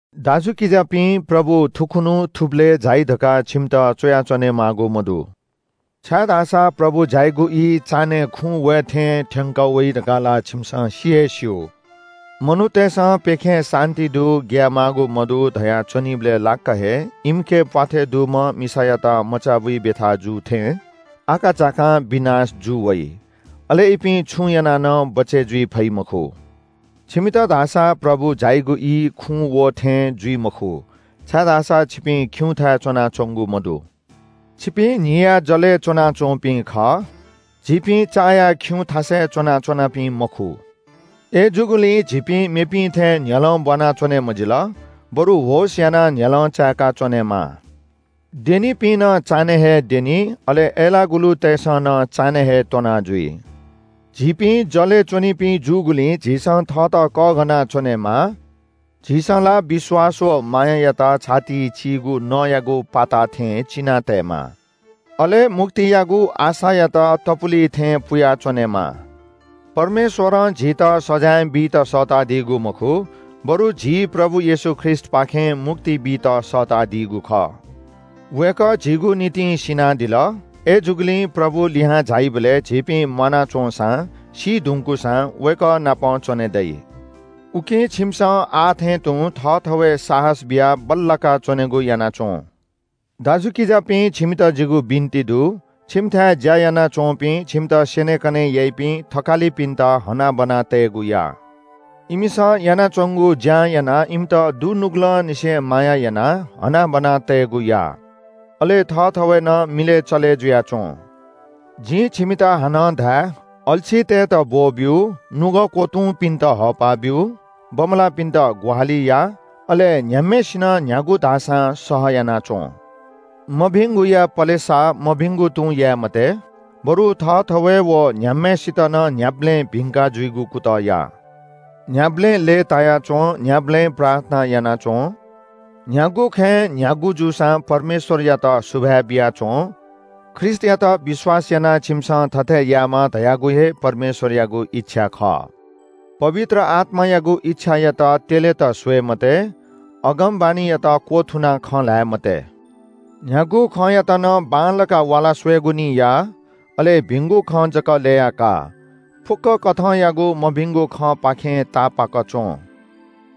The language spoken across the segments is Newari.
दाजुकिजापिं, प्रभु थुखुन्‍हु थुबलय् झाइ धकाः छिमित च्‍वया च्‍वनेमाःगु मदु, छाय्‌धाःसा प्रभु झाइगु ई चान्‍हय् खुँ वये थें थ्‍यंकः वइ धकाः ला छिमिसं सि हे स्‍यू। मनूतय्‌सं प्‍यखें “शान्‍ति दु, ग्‍याये माःगु मदु” धया च्‍वनीबलय् लाक्‍क हे इमिके प्‍वाथय् दुम्‍ह मिसायात मचाबुइ ब्‍यथा जू थें आकाझाकां विनाश जू वइ। अले इपिं छुं यानाः नं बचय् जुइ फइ मखु। छिमित धाःसा प्रभु झाइगु ई खुँ वः थें जुइ मखु, छाय्‌धाःसा छिपिं खिउँथाय् च्‍वनाच्‍वंगु मदु। छिपिं न्‍हिया जलय् च्‍वनाच्‍वंपिं खः। झीपिं चाया खिउँथासय् च्‍वना च्‍वनापिं मखु। अय्‌जूगुलिं झीपिं मेपिं थें न्‍ह्यलं ब्‍वाना च्‍वने मजिल, बरु होश यानाः न्‍ह्यलं चाय्‌का च्‍वनेमाः। द्यनीपिं नं चान्‍हय् हे द्यनी, अले अय्‌लाःगुलुतय्‌सं नं चान्‍हय् हे त्‍वनाजुइ। झीपिं जलय् च्‍वनीपिं जूगुलिं झीसं थःत कःघाना च्‍वनेमाः। झीसं ला विश्‍वास व मायायात छातिइ चीगु नँयागु पाता थें चिना तयेमाः अले मुक्तियागु आशायात तपुलि थें पुया च्‍वनेमाः। परमेश्‍वरं झीत सजाँय बीत सःतादीगु मखु, बरु झी प्रभु येशू ख्रीष्‍टपाखें मुक्ति बीत सःतादीगु खः। वय्‌कः झीगु निंतिं सिनादिल। अय्‌जूगुलिं प्रभु लिहां झाइबलय् झीपिं म्‍वाना च्‍वंसां, सी धुंकूसां वय्‌कः नाप च्‍वने दइ। उकिं छिमिसं आः थें तुं थःथवय् साहस बियाः बल्‍लाका च्‍वनेगु याना च्‍वँ। दाजुकिजापिं, छिमित जिगु बिन्‍ति दु – छिमिथाय् ज्‍या यानाच्‍वंपिं, छिमित स्‍यनेकने याइपिं थकालिपिन्‍त हनाबना तयेगु या। इमिसं यानाच्‍वंगु ज्‍यां यानाः इमित दुनुगलंनिसें माया यानाः हनाबना तयेगु या। अले थःथवय् नं मिलय् चले जुयाच्‍वँ। जिं छिमित हानं धाये – अल्‍छीतय्‌त ब्‍वःब्‍यु, नुगः क्‍वतुंपिन्‍त हःपा ब्‍यु, बमलाःपिन्‍त ग्‍वाहालि या, अले न्‍ह्याम्‍हय्‌सिनं न्‍ह्यागु धाःसां सह यानाच्‍वँ। मभिंगुया पलेसा मभिंगु तुं याये मते, बरु थःथवय् व न्‍ह्याम्‍हय्‌सित नं न्‍ह्याबलें भिंका जुइगु कुतः या। न्‍ह्याबलें लय्‌ताया च्‍वँ। न्‍ह्याबलें प्रार्थना याना च्‍वँ। न्‍ह्यागु खँय् न्‍ह्यागु जूसां परमेश्‍वरयात सुभाय् बियाः च्‍वँ। ख्रीष्‍टयात विश्‍वास यानाः छिमिसं थथे यायेमा धयागु हे परमेश्‍वरयागु इच्‍छा खः। पवित्र आत्‍मायागु इच्‍छायात त्‍यलेत स्‍वये मते। अगमवाणीयात क्‍वथुनाः खँ ल्‍हाये मते। न्‍ह्यागु खँयात नं बांलाक वाला स्‍वयेगु निं या। अले भिंगु खँ जक ल्‍यया का। फुक्‍क कथंयागु मभिंगु खँपाखें तापाक च्‍वँ।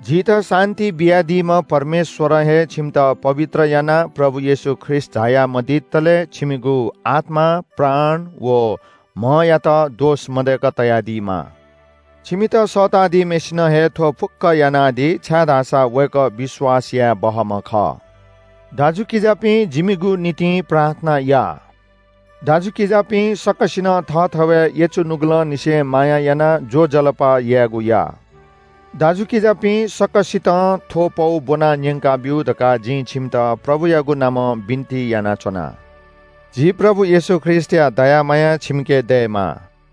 झीत शान्‍ति बियादीम्‍ह परमेश्‍वरं हे छिमित पवित्र यानाः प्रभु येशू ख्रीष्‍ट झाया मदितले छिमिगु आत्‍मा, प्राण व म्‍हयात दोष मदय्‌क तयादीमा। छिमित सःता दीम्‍हय्‌सिनं हे थ्‍व फुक्‍क यानादी, छाय्‌धाःसा वय्‌कः विश्‍वास याये बहःम्‍ह खः। दाजुकिजापिं, जिमिगु निंतिं प्रार्थना या। दाजुकिजापिं सकसिनं थःथवय् यचु नुगलंनिसें माया यानाः ज्‍वजलपा यायेगु या। दाजुकिजापिं, सकसितं थ्‍व पौ ब्‍वना न्‍यंकाब्‍यु धकाः जिं छिमित प्रभुयागु नामं बिन्‍ति यानाच्‍वना। झी प्रभु येशू ख्रीष्‍टया दया माया छिमिके दयेमा।